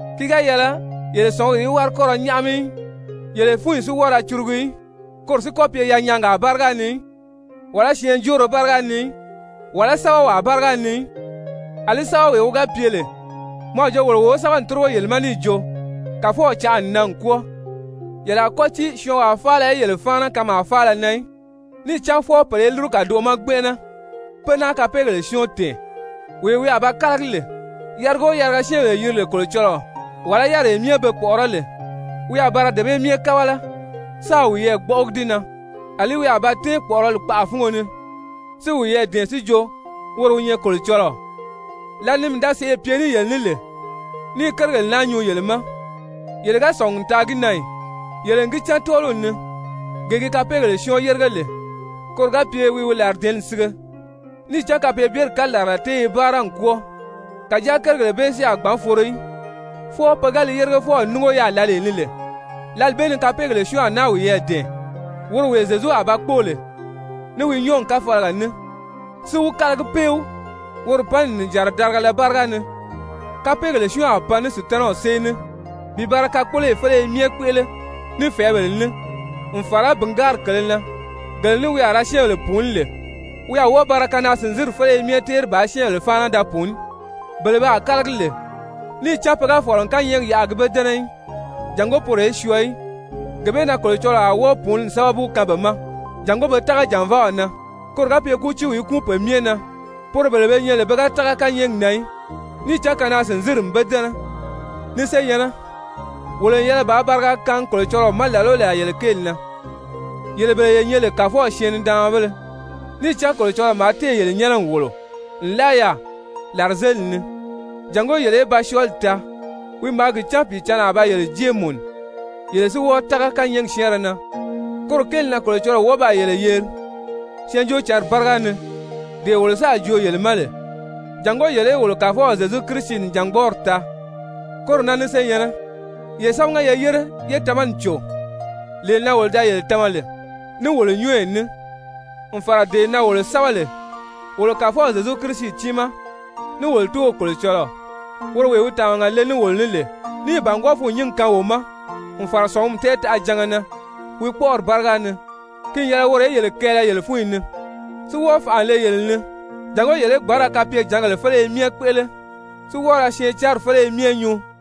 ki ga yɛlɛ yele sɔ̀nguri í wári kɔ́ ra nyáʔami í, yele fúnyi si wɔ́ɔ ra curugu í, koro si kɔ́ pye yanyaagaa báriga ni í, wàlá syɛɛnjóoro báriga ni í, wàlá sɛ́bɛwaa báriga ni í, àlí sɛ́bɛwee wi ga pye lè mɔ a jo wolo wo wi sɛ́bɛ n tórigo yele ma níì jo, Kàfɔw canʔa n nan n kwɔ́ɔ. Yele a kɔ́ tíi syɔɔnwaa faala í yele fáana kanmaa faala na í. Níì cán fwɔɔ pèle í lúru kàdoʔo ma gbɛnʔɛnɛ, pé náa Kapeegèle Syɔ́ɔn tɛ̀ɛn, wee wi a ba kálagi lè. Yariga o yariga syɛ́ɛnbèle yiri lè Kolocɔlɔɔ, wàlá yáriree be kpɔ̀ʔɔrɔ́ lè, wi a ba ra dee bee myɛ kábala, sáā wiyɛɛ gbɔ́ʔɔgi di na, àlí wi a ba tɛ́ɛn kpɔ̀ʔɔrɔli kpaʔa fúngo ni, si wiyɛɛ dɛ̀ɛn si jo, woro wi nyɛ Kolocɔlɔɔ. Lǎli ni mii da sèʔê pye ní yele ní lè ní i kérigèle naa nyuu yele ma, yele ga sɔ̀ngi n taa gi na ì? Yele n gi cán tɔ́ɔliw ni, gee gi Kapeegèle Syɔ́ɔn yérige lè koro ga pye wi wi làridɛ̀ɛ́nni sige. Níì cán kapeebyeri kalarala tée i báara n kwɔ́ɔ, kàjáa kérigèle bee si a gbǎn foro í, fwɔɔ pe ga li yérigefɔw núngo yaà lǎlee ni lè. Lǎli bee ni Kapeegèle Syɔ́ɔn a wiyɛɛ dɛ̀ɛn, woro wee Zyezu a ba kpóo lè ní wi nyɔ́ɔgi káfalaga ní, si wi kálagi péw woro panni nìjanra darigala báriga ni. Kapeegèle Syɔ́ɔn a pan ní Sutanaw sée ní bi ba ra kakpoloyi féleye myɛ kpéʔele, ní fɛ̀ɛ́bèle ní, n fàra bìngaari kèlē na, gele ní wi a ra syɛ́ɛnbèle pùuní lè, wi a wɔ́ɔ ba ra kanaa-sìnzinri féleye myɛ téeri bàā syɛ́ɛnbèle fáana da pùuní, bele pe a kálagi lè, níì cán pe ga fɔ̀lɔ n kányɛɛgi yaʔa a gi be dɛ́nɛ í, jàngó poro í syɔɔ í. Gee bee na Kolocɔlɔɔ a wɔ́ɔ pùununi sábabu kaan be ma jàngó pe tága jànvaaw na. Koro ga pye kútiiw í kúun pe myɛ na poro bele be nyɛ lè pe ga tága kányɛɛgi na í, níì cán kanaa-sìnzinri n be dɛ́nɛ. Ni senyɛ̀nnɛ, wolo n yɛlɛ bàā bariga kaangi Kolocɔlɔɔ ma làla o làla yele kéeli na, yele bele ye nyɛ lè Kàfɔw syɛɛn-nidaanmabéle, níì cán Kolocɔlɔɔ maa téè yele nyɛ́nɛ n wòlo nlaa yaà làrizelili ni, jàngó yele í ba syɔɔli taa, wi maa gi cán Pìicǎnni a ba yele jée mùnu, yele si wɔ́ɔ tága kányɛɛgi syɛ́ɛnrɛ na. Koro kéeli na Kolocɔlɔɔ wɔ́ɔ baa yele yeri Syɛɛnjóocǎnri báriga ni, dee wolo sáà joo yele ma lè, jàngó yele í wolo Kàfɔw Zyezu Kirisi nìjangbɔɔri taa. Koro na ni senyɛ̀nnɛ, ye sámaga ye yére yé tamani cò, lee na wolo da yele tama lè ní wolo nyɔ́ɔyi ní, n fàra dee na wolo sɛ́bɛ lè. Wolo Kàfɔw Zyezu Kirisi tiimaa, ní wolo Tóow Kolocɔlɔɔ, woro wee wi tàmaga le ní wolo ní lè, níì bàngwɔɔ fûnnyingi kaan wo ma n fàra sɔ̀ngumi tɛɛtaʔajanga na wi kpɔ́ʔɔri báriga ni, ki n yɛlɛ woro í yele kɛɛlɛ yele fúnyi ni, si wɔ́ɔ fànʔa le yele ni jàngó yele í gbǎn ra kapyejǎngèle féleye myɛ kpéʔele, si wɔ́ɔ ra syɛɛncanri féleye myɛ nyuu.